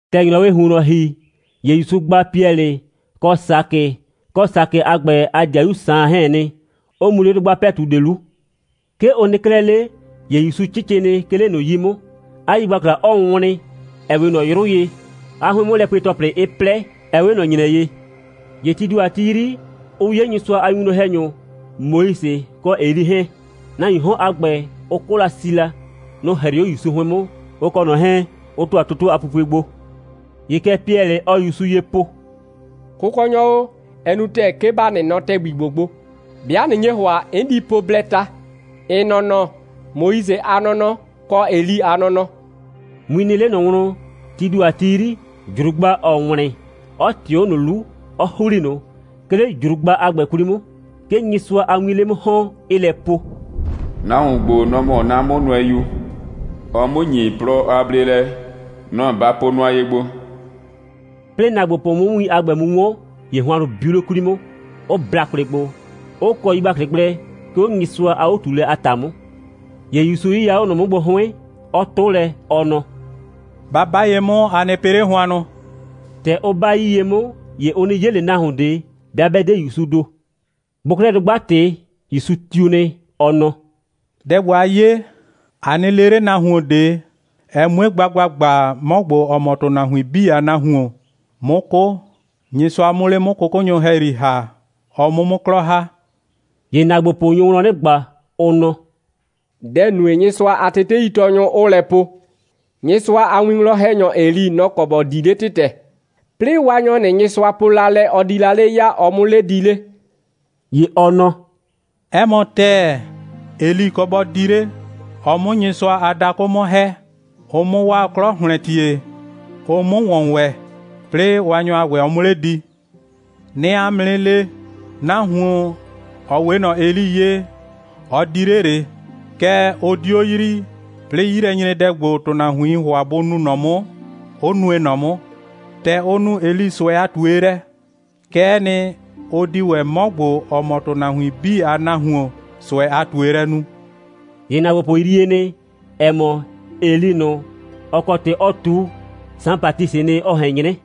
‑Tɛ ‑nyrɔwɩɩ ‑huonnɔ ‑hi, ‑ye ‑Yusu gba Piɛlɩ, kɔ Sakɩ, kɔ Sakɩ a ‑gbɛ a ‑dɩayu Saan 'hɛɛn nɩ, 'ʋ mu 'le dʋgba ‑pɛtu ꞊de 'lu. 'Ke ʋ nɩ 'klɛɛ 'le, ‑ye ‑Yusu 'cɩcɩ nɩ, 'ke 'le ꞊nʋ 'yi 'mʋ, 'a yigbakla 'ɔɔ wlɩn, ‑ɛ 'we ꞊nɔ 'yrʋ ye, 'a 'hʋɩn'mʋlɛpue‑tɔplɩ 'ɩ 'plɛ, ‑ɛ 'we ꞊nɔ ‑nyrɛ ye. ‑Ye tii ‑do a ti 'yri, ʋ 'ye Nyɩsʋa a winwlɔn‑hɛnyʋ Moise kɔ Eli 'hɛɛn. Nahuiin 'hɔn a ‑gbɛ, ʋ 'kʋ la si la. Nʋ‑ 'hrɩɩ 'o ‑Yusu 'hʋɩn 'mʋ, ʋ kɔ ꞊nɔ 'hɛɛn, 'ʋ ‑tʋa toto a pupue gbo. ‑Ye kɛ Piɛlɩ, ɔɔ ‑Yusu ye po: «Kʋkɔnyɔ o, ɛ nu ‑tɛɛ, 'ke ‑ba nɩ nɔ ‑tɛgbi ‑gbo gbo. 'Bɩa ꞊nɩ nye ‑hʋa, 'n di po blɛɛ ta: ‑n nɔnɔ, Moise a nɔnɔ, kɔ Eli a nɔnɔ.» Win nɩ 'le ꞊nɔ wlɔn, tii ‑do a ti 'yri, ‑jrugba 'ɔɔ wlɩn, 'ɔ ꞊tɩɩ 'o ꞊nʋ 'lu, 'ɔ ‑hli ꞊nʋ. 'Ke 'le ‑jrugba a ‑gbɛ 'kwli 'mʋ, 'ke Nyɩsʋa a wiin 'le 'mʋ ‑hɔn, 'ɩɩ lɛ po: «Nahuon ‑gbo, nɔ‑ mɔ 'na 'mʋnʋɛyu. Ɔɔ 'mʋ ‑nyi plɔ a bleelɛ. Nɔ‑ ba po nʋa ye gbo.» 'Plɩɩ ‑naagbopʋ 'mʋ win a ‑gbɛ mu 'wɔn, ‑ye hʋannʋ biu 'le 'kwli 'mʋ, 'ʋ bla kwlɩ gbo, 'ʋ kɔ yigbaklɩ gblɛ, 'ke 'o Nyɩsʋa a 'o꞊tuulɛ a ‑ta 'mʋ. ‑Ye ‑Yusu 'yɩya 'o ꞊nʋ 'mʋ gbo 'hʋɩn, 'ɔ 'tʋ lɛ, ɔ nɔ: «Ba 'ba ye 'mʋ, a nɩ pɩ 'le hʋannʋ!» ‑Tɛ ʋ 'ba 'yii ye 'mʋ, ‑ye ʋ 'nɩ 'ye ꞊le nahuon ꞊de, 'bɩa 'bɛ 'de ‑Yusuu ‑do. Bʋʋ 'klɛɛ dʋgba ꞊tɩ, ‑Yusu tiu nɩ, ɔ nɔ: «Dɛ ‑gbo, a 'ye, a nɩ le 'le nahuon ꞊de, ɛ 'mue gba ‑gbagba, 'mɔ ‑gbo, ‑ɔ mɔ ‑tʋnahuin 'bii a Nahuon, 'mʋ 'kʋ, Nyɩsʋa 'mʋ 'le 'mʋ 'kʋkʋnyʋ ‑hɛyri ‑ha, ɔ 'mʋ 'mʋ 'klɔ ‑ha.» ‑Ye ‑naagbopʋ nyo wlɔn 'nɩ ꞊gba, ʋ nɔ: «Dɛ‑ nue, Nyɩsʋa a teteitɔɔnyʋ 'ʋʋ lɛ po, Nyɩsʋa a winwlɔn‑hɛnyɔ Eli, nɔ‑ kɔ ‑bɔ di 'le ‑tɩtɛ, 'plɩɩ Waanyɔ ꞊nʋ, Nyɩsʋa po la lɛ, ɔ di la 'le ya, ɔ 'mʋ 'le di 'le?» ‑Ye ɔ nɔ: «'Ɛ mɔ ‑tɛɛ, Eli kɔ bɔ di 'le, ɔ 'mʋ Nyɩsʋa a dakʋ 'mʋ ‑hɛ, ʋ 'mʋ 'waa 'klɔ ‑hlɛntie, ʋ 'mʋ ‑wɔn ‑wɛ, 'plɩɩ Waanyɔ a ‑gbɛ, ɔ 'mʋ 'le di. 'Nɩɩ 'a mʋ 'nɩ le: Nahuon, ‑ɔ 'we ꞊nɔ Eli ye, ɔ di 'le ꞊le, kɛɛ, ʋ 'dio yrii, 'plɩɩ 'yilɛnyredɛ ‑gbo, ‑tʋnahuiin ‑hʋa bʋ nu ꞊nɔ 'mʋ, 'ʋ nue ꞊nɔ 'mʋ. ‑Tɛ ʋ nu Eli ꞊sʋɛ a ꞊tuelɛ, kɛ'ɛ nɩ, ʋ di ‑wɛ 'mɔ ‑gbo, ‑ɔ mɔ ‑tʋnahuin 'bii a Nahuon, ꞊sʋɛ a ꞊tuelɛ nu.» ‑Ye ‑naagbopʋ yrie nɩ, ‑ɛ mɔ, Eli ꞊nʋ, ‑ɔ kɔ ‑tɩ ɔ ꞊tu, Saan Batisɩɩ nɩ, ɔ ꞊hɛn 'nyrɛ.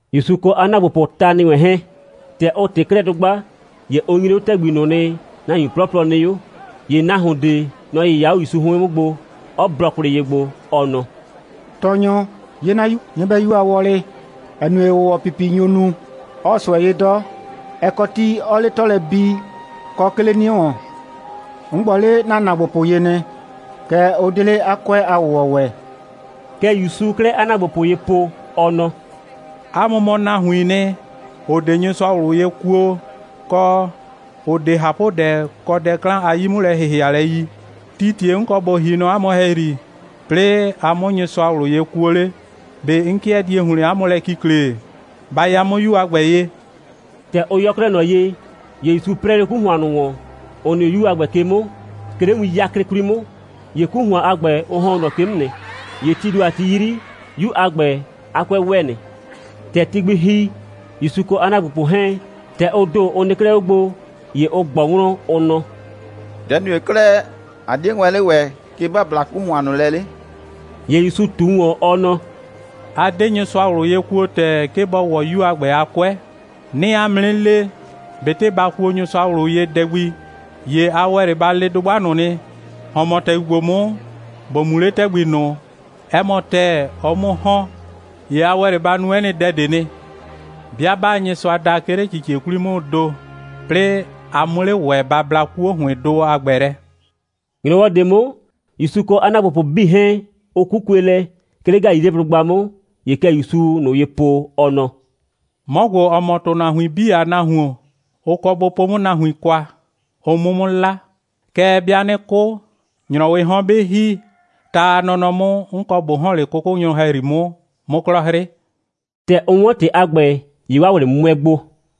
‑Yusu kɔ 'a ‑naagbopʋʋ ta ‑nɩ wɛn 'hɛɛn, ‑tɛ ʋ ꞊tɩ 'klɛɛ dʋgba, ‑ye ʋ nyre 'o ‑tɛgbi ꞊nʋ nɩ, nahuin 'plɔplɔ nɩ 'o. ‑Ye nahuon ꞊de, nɔ‑ 'yɩya 'o ‑Yusu 'hʋɩn 'mʋ gbo, 'ɔ blɔ kwlɩ ye gbo, ɔ nɔ: «Tɔɔnyɔ, 'ye 'na 'yu nyɩbɛyu a wɔlɩ, ‑ɛ nue, ‑wʋwɔpipi nyo nu, 'ɔɔ ꞊sʋɛ 'ye 'dɔ. Ɛ kɔ ti, 'ɔɔ 'le 'tɔ lɛ bi, kɔ 'ke 'le 'nie ‑wɔn. 'N gbɔ 'le ‑na ‑naagbopʋ ye nɩ, kɛɛ, ʋ 'de 'le 'a 'kʋɛ a ‑wʋwɔ ‑wɛ.» Kɛ ‑Yusuu 'klɛɛ 'a ‑naagbopʋ ye po, ɔ nɔ: «'A mʋ mɔ nahuiin nɩ, ‑ʋ 'de Nyɩsʋa ꞊wlʋ ye kuo, kɔ, ‑ʋ 'de ꞊hapʋdɛ kɔ dɛ 'klan a 'yi'mʋlɛ‑hɩhɩalɛ yi. Tii ‑tie 'n kɔ ꞊bo ‑hi nɔ 'a mʋ ‑hɛyri, 'plɩɩ a 'mʋ Nyɩsʋa ꞊wlʋ ye kuo 'le? ꞊Be 'n 'kɩɛ die ‑hlɩn 'a mʋ lɛ kikle? Ba ya 'mʋ 'yu a ‑gbɛ ye!» ‑Tɛ ʋ yɔ 'klɛɛ ꞊nɔ ye, ‑ye ‑Yusu 'prɛɛ 'le 'ku ‑hʋan ꞊nʋ ‑wɔn, ‑ʋ nɩ 'o 'yu a ‑gbɛ ke 'mʋ, 'ke 'le win 'yaklɩ 'kwli 'mʋ. ‑Ye 'ku ‑hʋan a ‑gbɛ, ʋ ‑hɔn 'o ꞊nɔ ke 'mʋ nɩ. ‑Ye tii ‑do a ti 'yri, 'yu a ‑gbɛ a 'kʋɛ ‑wɛ nɩ. ‑Tɛ ti gbi ‑hi, ‑Yusu kɔ 'a ‑naagbopʋ 'hɛɛn, ‑tɛ ʋ ‑do, ʋ nɩ 'klɛɛ 'o gbo, ‑ye ʋ ꞊gbɔ wlɔn, ʋ nɔ: «Dɛ‑ nue 'klɛɛ, ꞊a 'die wɛn 'le ‑wɛ, 'ke ‑ba bla 'ku ‑hʋan ꞊nʋ lɛ 'le?» ‑Ye ‑Yusu ꞊tu ‑wɔn, ɔ nɔ: «A 'de Nyɩsʋa ꞊wlʋ ye kuo ‑tɛɛ, 'ke bɔ ‑wɔ 'yu a ‑gbɛ a 'kʋɛ. 'Nɩɩ 'a mʋ 'nɩ le, ꞊betɩ ba kuo Nyɩsʋa ꞊wlʋ ye dɛ gbi, ‑ye a ‑wɛ 'le ba le dʋgba ꞊nʋ nɩ: ‑Hɔn mɔ ‑tɛgbi ‑gbo 'mʋ, ‑bo mu 'le ‑tɛgbi ꞊nʋ, 'ɛ mɔ ‑tɛɛ, ɔ 'mʋ 'o ‑hɔn. ‑Ye a ‑wɛ 'le ba nu 'ɛ nɩ dɛ ꞊de nɩ. [ 'Bɩa 'baa Nyɩsʋa da, 'ke 'le ꞊cicie 'kwli 'mʋʋ ‑do, 'plɩɩ a 'mʋ 'le ‑wɛ ba bla 'kuo ‑hʋɩndʋ a ‑gbɛ lɛ.]» ‑Nyrɔwɔ ꞊de 'mʋ, ‑Yusu kɔ 'a ‑naagbopʋ 'bii 'hɛɛn, ʋ 'kukue lɛ, 'ke 'le Galileblʋgba 'mʋ. ‑Ye kɛ ‑Yusuu ꞊nʋ ye po, ɔ nɔ: «'Mɔ ‑gbo, ‑ɔ mɔ ‑tʋnahuin 'bii a Nahuon, ʋ kɔ bʋ po 'mʋ nahuin kwa, ʋ 'mʋ 'mʋ 'la. Kɛɛ, 'bɩa 'nɩ 'kʋ, ‑nyrɔwɩɩ 'hɔn 'bɩ ‑hi, ta a nɔnɔ 'mʋ, 'n kɔ ꞊bo ‑hɔn 'le 'kʋkʋnyʋ ‑hɛyri 'mʋ, 'mʋ 'klɔ 'hrɩ.» ‑Tɛ ʋ 'wɔn ‑tɩ a ‑gbɛ, ‑ye 'waa ꞊wlɩ 'mʋɛ ‑gbo.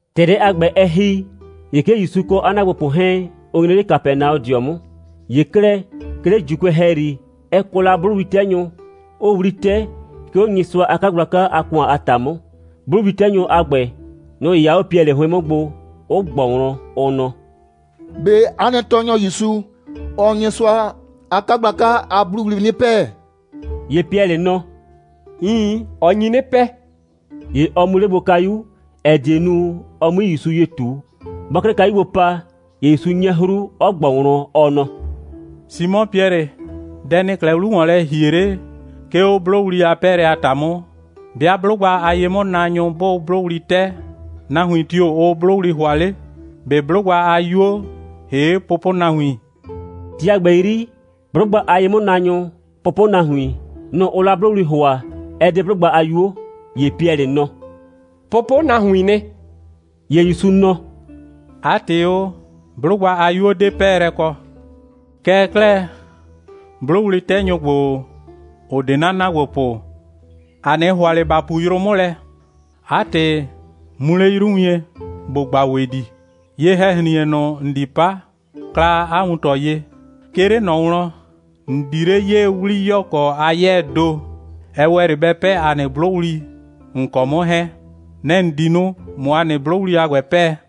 ‑Tɛ dɛ a ‑gbɛ, ɛ ‑hi, ‑ye 'ke ‑Yusu kɔ 'a ‑naagbopʋ 'hɛɛn, ʋ nyre 'le Kapɛnaɔdɩɔ 'mʋ. ‑Ye 'klɛɛ, 'ke 'le ‑Juukʋɛ ‑hɛyri, ɛ kɔ la 'blʋwli'tɛnyʋ, 'ʋʋ 'wli 'tɛ, 'ke 'o Nyɩsʋa a 'kagblaka a ‑kʋan a ‑ta 'mʋ. 'Blʋwli'tɛnyʋ a ‑gbɛ, nʋ‑ 'yɩya 'o Piɛlɩ 'hʋɩn 'mʋ gbo, 'ʋ ꞊gbɔ wlɔn, ʋ nɔ: «꞊Be 'a nɩ tɔɔnyɔ ‑Yusu, ɔɔ Nyɩsʋa a 'kagblaka a 'blʋwli 'nɩ 'pɛɛ?» ‑Ye Piɛlɩ nɔ: «Iin, ɔ nyi 'nɩ 'pɛɛ.» ‑Ye ɔ mu 'le gbo kayu, ‑ɛ die nu, ɔ 'mui ‑Yusu ye ꞊tu. Bɔɔ 'klɛɛ kayu gbo pa, ‑ye ‑Yusu 'nyɛ 'hru, 'ɔ ꞊gbɔ wlɔn, ɔ nɔ: «Simɔ Piɛlɩ, dɛ ‑nɩɩ 'klɛɛ 'lu ‑wɔn lɛ ‑hie 'le, 'ke 'o 'blʋwli a 'pɛɛlɛ a ‑ta 'mʋ? 'Bɩa 'blʋgba a ye'mʋnaanyʋ 'bʋʋ 'blʋwli 'tɛ, nahuin tio‑ ʋʋ 'blʋwli ‑hʋa 'le? ꞊Be 'blʋgba a 'yuo, ‑hee' pʋpʋnahuin?» (Ti a ‑gbɛ 'yri, 'blʋgba a ye'mʋnaanyʋ, pʋpʋnahuin, nʋ‑ ʋʋ la 'blʋwli ‑hʋa, ɛ 'de 'blʋgba a 'yuo.) ‑Ye Piɛlɩ nɔ: «Pʋpʋnahuiin nɩ.» ‑Ye ‑Yusu nɔ: «'A ‑tɩ o, 'blʋgba a 'yuo 'de 'pɛɛlɛ kɔ. Kɛɛ 'klɛɛ, 'blʋwli'tɛnyʋ ‑gbo, ‑ʋ 'de 'na ‑naagbopʋ, ‑a 'nɩ ‑hʋa ꞊le ‑ba pu yrʋ 'mʋ lɛ. 'A ‑tɩ, mu 'le 'yru wien, ‑bo ꞊gba ‑wedi. Ye‑hɛ‑hrin.e ꞊nʋ, ‑n di 'pa, kla 'a wuntɔ ye. 'Ke 'le ꞊nɔ wlɔn, ‑n di 'le 'yee 'wliyɔkɔ a 'yɛɛ ‑do, ‑ɛ ‑wɛ 'le ‑bɛ 'pɛɛ ‑a nɩ 'blʋwli, ‑n kɔ 'mʋ 'hɛɛn. Nɛ‑ ‑n di nu, ꞊mʋ ‑a nɩ 'blʋwli a ‑gbɛ 'pɛɛ.»